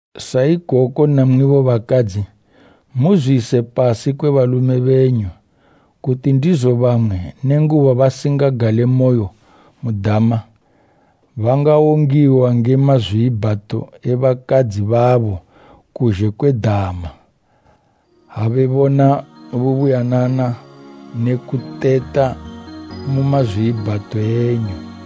Sa ikoko namwibo bakadzi, muzwiyise pasi kwe balume benyu, kuti ndizo bamwe, nenguba basingagalemoyo mu dama, bangawongiwa nge mazwiibhato e bakadzi babo kuzhe kwe dama, ha bebona bubuyanana ne kuteta mu mazwiibhato enyu.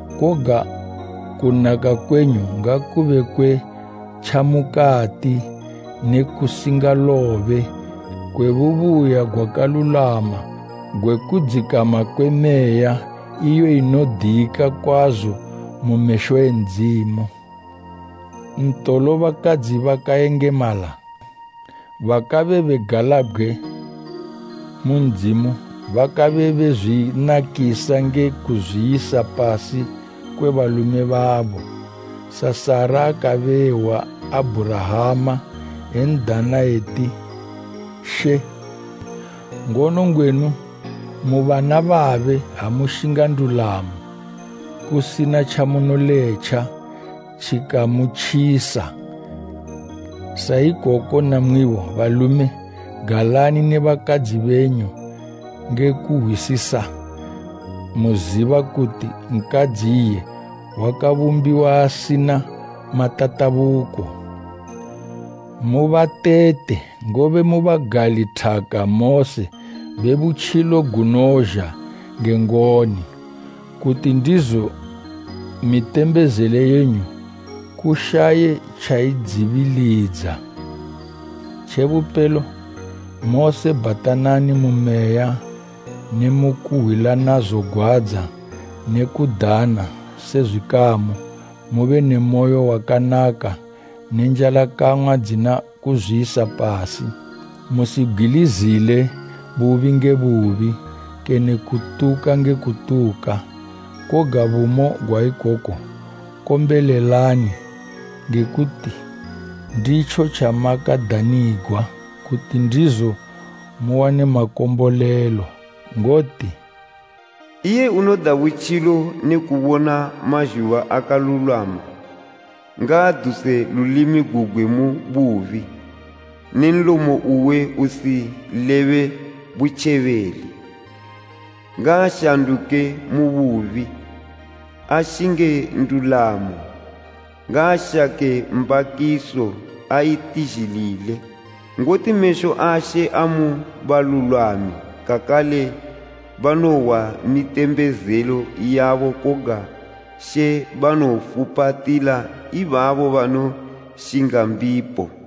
koga kunaka kwenyu ngakube kwe tjamukati ne kusingalobe kwe bubuya gwakalulwama gwe kudzikama kwe meya, iyo inodika kwazo mu mesho e Ndzimu. Ntolo, bakadzi bakayengemala, bakabe begalabgwe mu Ndzimu bakabe bezwinakisa nge kuzwiyisa pasi kwe balume babo, sa Sara akabe ehwa Abhurahama, en'dana eti She. Ngono ngwenu mu bana babe ha mushinga ndulamo, kusina tjamunoletja tjikamutjisa. Sa ikoko namwibo balume, galani ne bakadzi benyu nge kuhwisisa muziba kuti nkadzi iye wakabumbiwa asina matatabuko. Mubatete ngobe mu bagali thaka mose be butjilo gunozha nge ngoni. Kuti ndizo mitembezelo yenyu kushaye tjayidzibilidza. Tjebupelo, mose bhatanani mu meya ne mu kuhwilana zogwadza ne kudana se zwikamu, mube ne moyo wakanaka ne njalakang'wa dzina kuzwiyisa pasi. Musibgwilizile bubi nge bubi, kene kutuka nge kutuka. Koga bumo gwa ikoko kombolelani, nge kuti nditjo tjamakadanigwa, kuti ndizo muwane makombolelo. Ngoti, “Iye unoda butjilo ne kubona mazhuba akalulwama, ngaaduse lulimi gugwe mu bubi, ne nlomo uwe usilebe butjebeli. Ngaashanduke mu bubi, ashinge ndulamo, ngaashake mbakiso aitizhilile. Ngoti mesho a She amu balulwami, kakale banohwa mitembezelo yabo koga She banofupatila ibabo banoshinga mbipo.”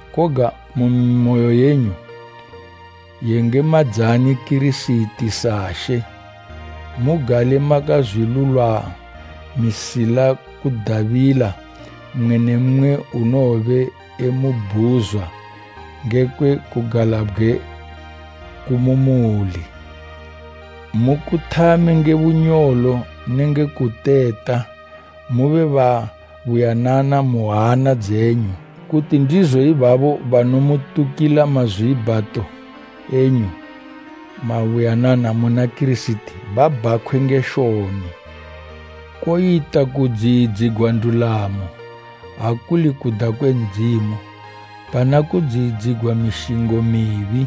koga mu mimoyo yenyu, yengemadzani Kirisiti sa She. Mugale makazwilulwamisila kudabila mmwe ne mmwe unowobe emubhuzwa ngekwe kugalabgwe ku mu muli, mukuthame nge bunyolo nenge kuteta. Mube babuyanana mu hana dzenyu, kuti ndizo ibabo banomutukila mazwiibhato enyu mabuyanana muna Kirisiti, babhakhwe nge shoni. Koyita kudziyidzigwa ndulamo, ha kuli kuda kwe Ndzimu, pana kudziyidzigwa mishingo mibi,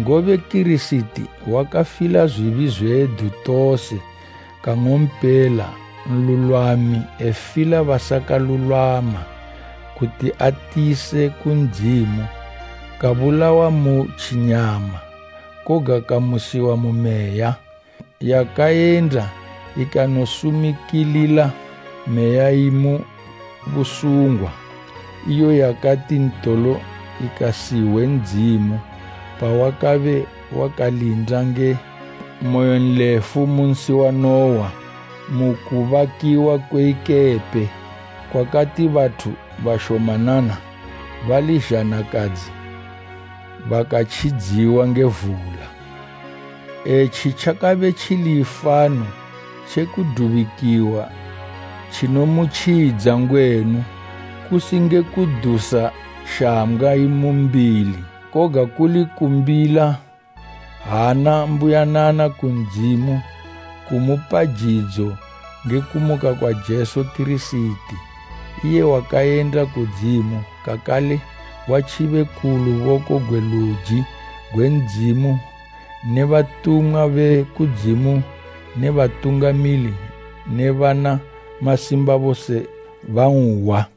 ngobe Kirisiti wakafila zwibi zwedu tose kang'ompela, nlulwami efila basakalulwama, kuti atiyise ku Ndzimu, kabulawa mu tjinyama, koga kamusiwa mu Meya, yakayenda ikanosumikilila meya imu busungwa, —7:24iyo yakati ntolo ikasihwe, Ndzimu pawakabe wakalinda nge moyonlefu mu nsi wa Nuwa, mu kubakiwa kwe ikepe; kwakati bathu bashomanana, bali zhanakadzi bakatjidziwa nge vula. Etji tjakabe tjili ifano tje kudubikiwa tjinomutjidza ngwenu, kusi nge kudusa shambgwa imu mbili, koga kuli kumbila hana mbuyanana ku Ndzimu jidzo nge kumuka kwa Jesu Kirisiti iye wakayenda kudzimu, kakale watjibe ku luboko gwe luji gwe Ndzimu ne batumwa be kudzimu ne batungamili ne bana masimba, bose banhwa.